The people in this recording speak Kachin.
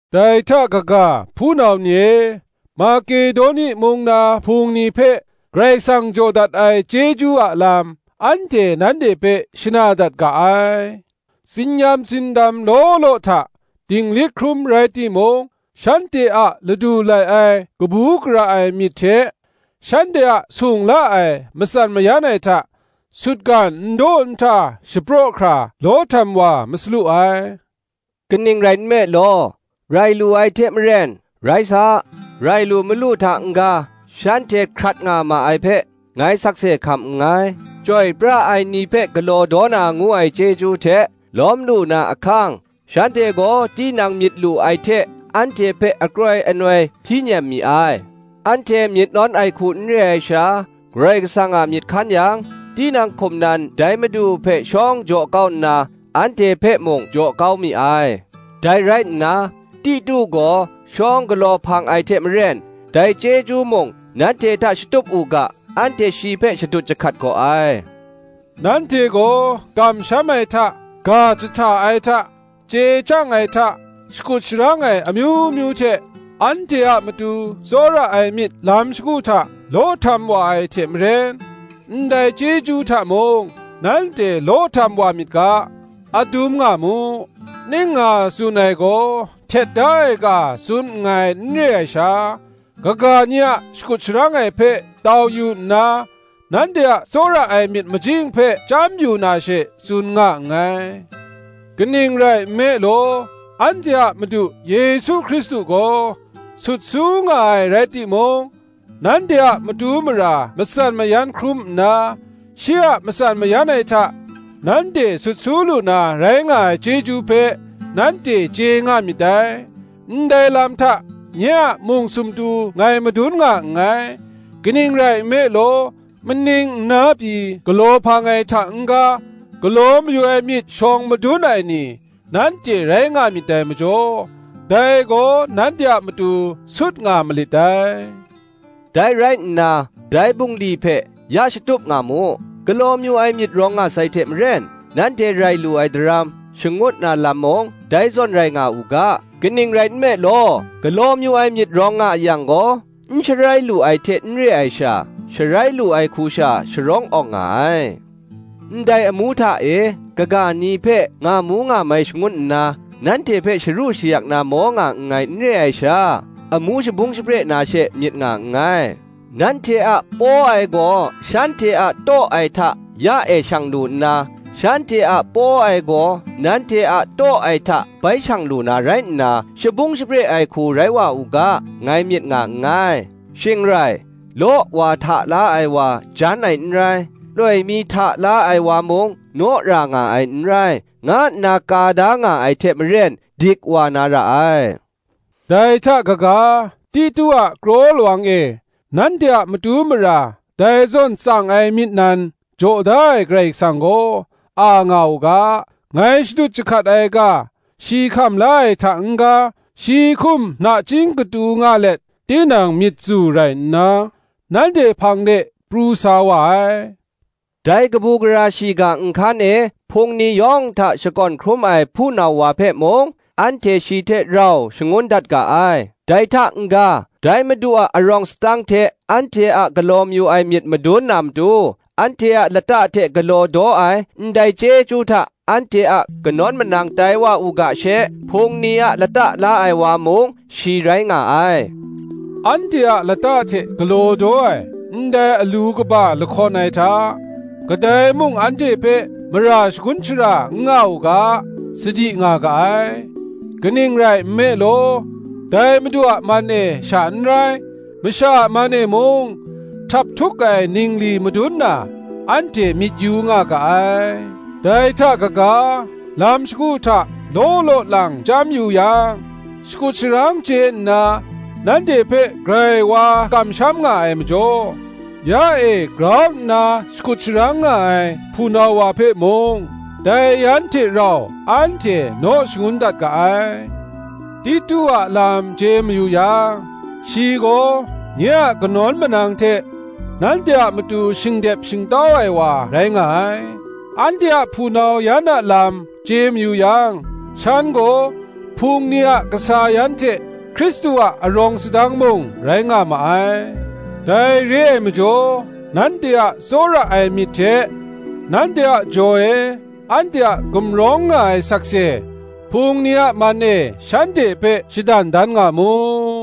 Dai hta kaga, hpunau ni e, Makedoni mung na hpung ni hpe Karai Kasang jaw dat ai chyeju a lam, anhte nanhte hpe shana dat ga ai: tsin-yam tsindam law law hta dinglik hkrum rai timung, shanhte a ladu lai ai kabu gara ai myit hte, shanhte a sung la ai matsan mayan ai hta, sutgan n daw n hta shapraw hkra law htam wa masalu ai. Kaning rai nme law, rai lu ai hte maren, rai sa, rai lu malu hta n-ga, shanhte hkrat nga ma ai hpe, ngai sakse hkam nngai; chyoi pra ai ni hpe galaw daw na ngu ai chyeju hte lawm lu na ahkang shanhte gaw tinang myit lu ai hte anhte hpe akroi anoi hpyi nem mi ai: anhte myit nawn ai hku n re ai sha, Karai Kasang a myit hkan yang, tinang hkum nan dai Madu hpe shawng jaw kau nna, anhte hpe mung jaw kau mi ai. Dai rai nna, Titu gaw shawng galaw hpang ai hte maren, dai chyeju mung nanhte hta shatup u ga, anhte shi hpe shadut jahkat gaw ai. Nanhte gaw kamsham ai hta, ga jahta ai hta, chye chyang ai hta, shakut sharang ai amyu myu hte, anhte a matu tsawra ai myit lam shagu hta law htam wa ai hte maren, ndai chyeju hta mung nanhte law htam wa myit ga, adum nga mu. Ning nga tsun ai gaw htet da ai ga tsun nngai n re ai sha, kaga ni a shakut sharang ai hpe tau yu nna nanhte a tsawra ai myit majing hpe chyam yu na she, tsun nga nngai. kaning rai nme law, anhte a Madu Yesu Hkristu gaw sut su nga ai rai timung, nanhte a matu mara matsan mayan hkrum nna, shi a matsan mayan ai hta nanhte sut su lu na rai nga ai chyeju hpe, nanhte chye nga myit dai. Ndai lam hta nye a mung sumtu ngai madun nga nngai: kaning rai nme law, maning nna pyi galaw hpang ai hta n-ga, galaw mayu ai myit shawng madun ai ni, nanhte rai nga myit dai majaw, dai gaw nanhte a matu sut nga malit dai. Dai rai nna dai bungli hpe ya shatup nga mu: galaw mayu ai myit rawng nga sai hte maren, nanhte rai lu ai daram, shangut na lam mung, dai zawn rai nga u ga. Kaning rai nme law, galaw mayu ai myit rawng nga a yang gaw, n sharai lu ai hte n re ai sha, sharai lu ai hku sha sharawng awng nga ai. Ndai amu hta e kaga ni hpe ngamu ngamai shangun nna, nanhte hpe sharu shayak na maw nga nngai n re ai sha, amu shabung shapre na she myit nga nngai: nanhte a law htam ai gaw shanhte a taw ai hta ya e shang lu nna, shanhte a law htam ai gaw nanhte a taw ai hta bai shang lu na rai nna, shabung shapre ai hku rai wa u ga, ngai myit nga nngai. Shing rai, Law wa hta la ai wa jan ai n rai, loi mi hta la ai wa mung naw ra nga ai n rai, nga nna ka da nga ai hte maren dik wa na ra ai. Dai hta kaga, Titu a kraw lawang e, nanhte a matu mara dai zawn tsang ai myit nan jaw da ai Karai Kasang gaw, a nga u ga. Ngai shadut jahkat ai ga shi hkam la ai hta n-ga, shi hkum nachying katu nga let, tinang myit tsu rai nna nanhte hpang de pru sa wa ai. Dai kabu gara shiga nhkan e Hpung ni yawng hta shakawn hkrum ai hpunau wa hpe mung, anhte shi hte rau shangun dat ga ai; dai hta n-ga, dai Madu a arawng sadang hte anhte a galaw mayu ai myit madun na matu, anhte a lata hte galaw daw ai, ndai chyeju hta anhte a kanawn manang tai wa u ga she, Hpung ni a lata la ai wa mung, shi rai nga ai: anhte a lata hte galaw daw ai, ndai alu kaba lahkawn ai hta, kadai mung anhte hpe mara shagun shara n nga u ga, sadi nga ga ai; kaning rai nme law, dai Madu a man e sha n rai, masha a man e mung htaphtuk ai ningli madun na, anhte myit yu nga ga ai. Dai hta kaga, lam shagu hta law law lang chyam yu yang, shakut sharang chye nna nanhte hpe grai wa kamsham nga ai majaw, ya e grau nna shakut sharang nga ai hpunau wa hpe mung, dai yan hte rau anhte naw shangun dat ga ai. Titu a lam chye mayu yang, shi gaw, nye a kanawn manang hte nanhte a matu shingdep shingtau ai wa rai nga ai; anhte a hpunau yan a lam chye mayu yang, shan gaw, Hpung ni a kasa yan hte Hkristu a arawng sadang mung rai nga ma ai. Dai re ai majaw, nanhte a tsawra ai myit hte, nanhte a jaw e anhte a gumrawng nga ai sakse, Hpung ni a man e shanhte hpe shadan dan nga mu.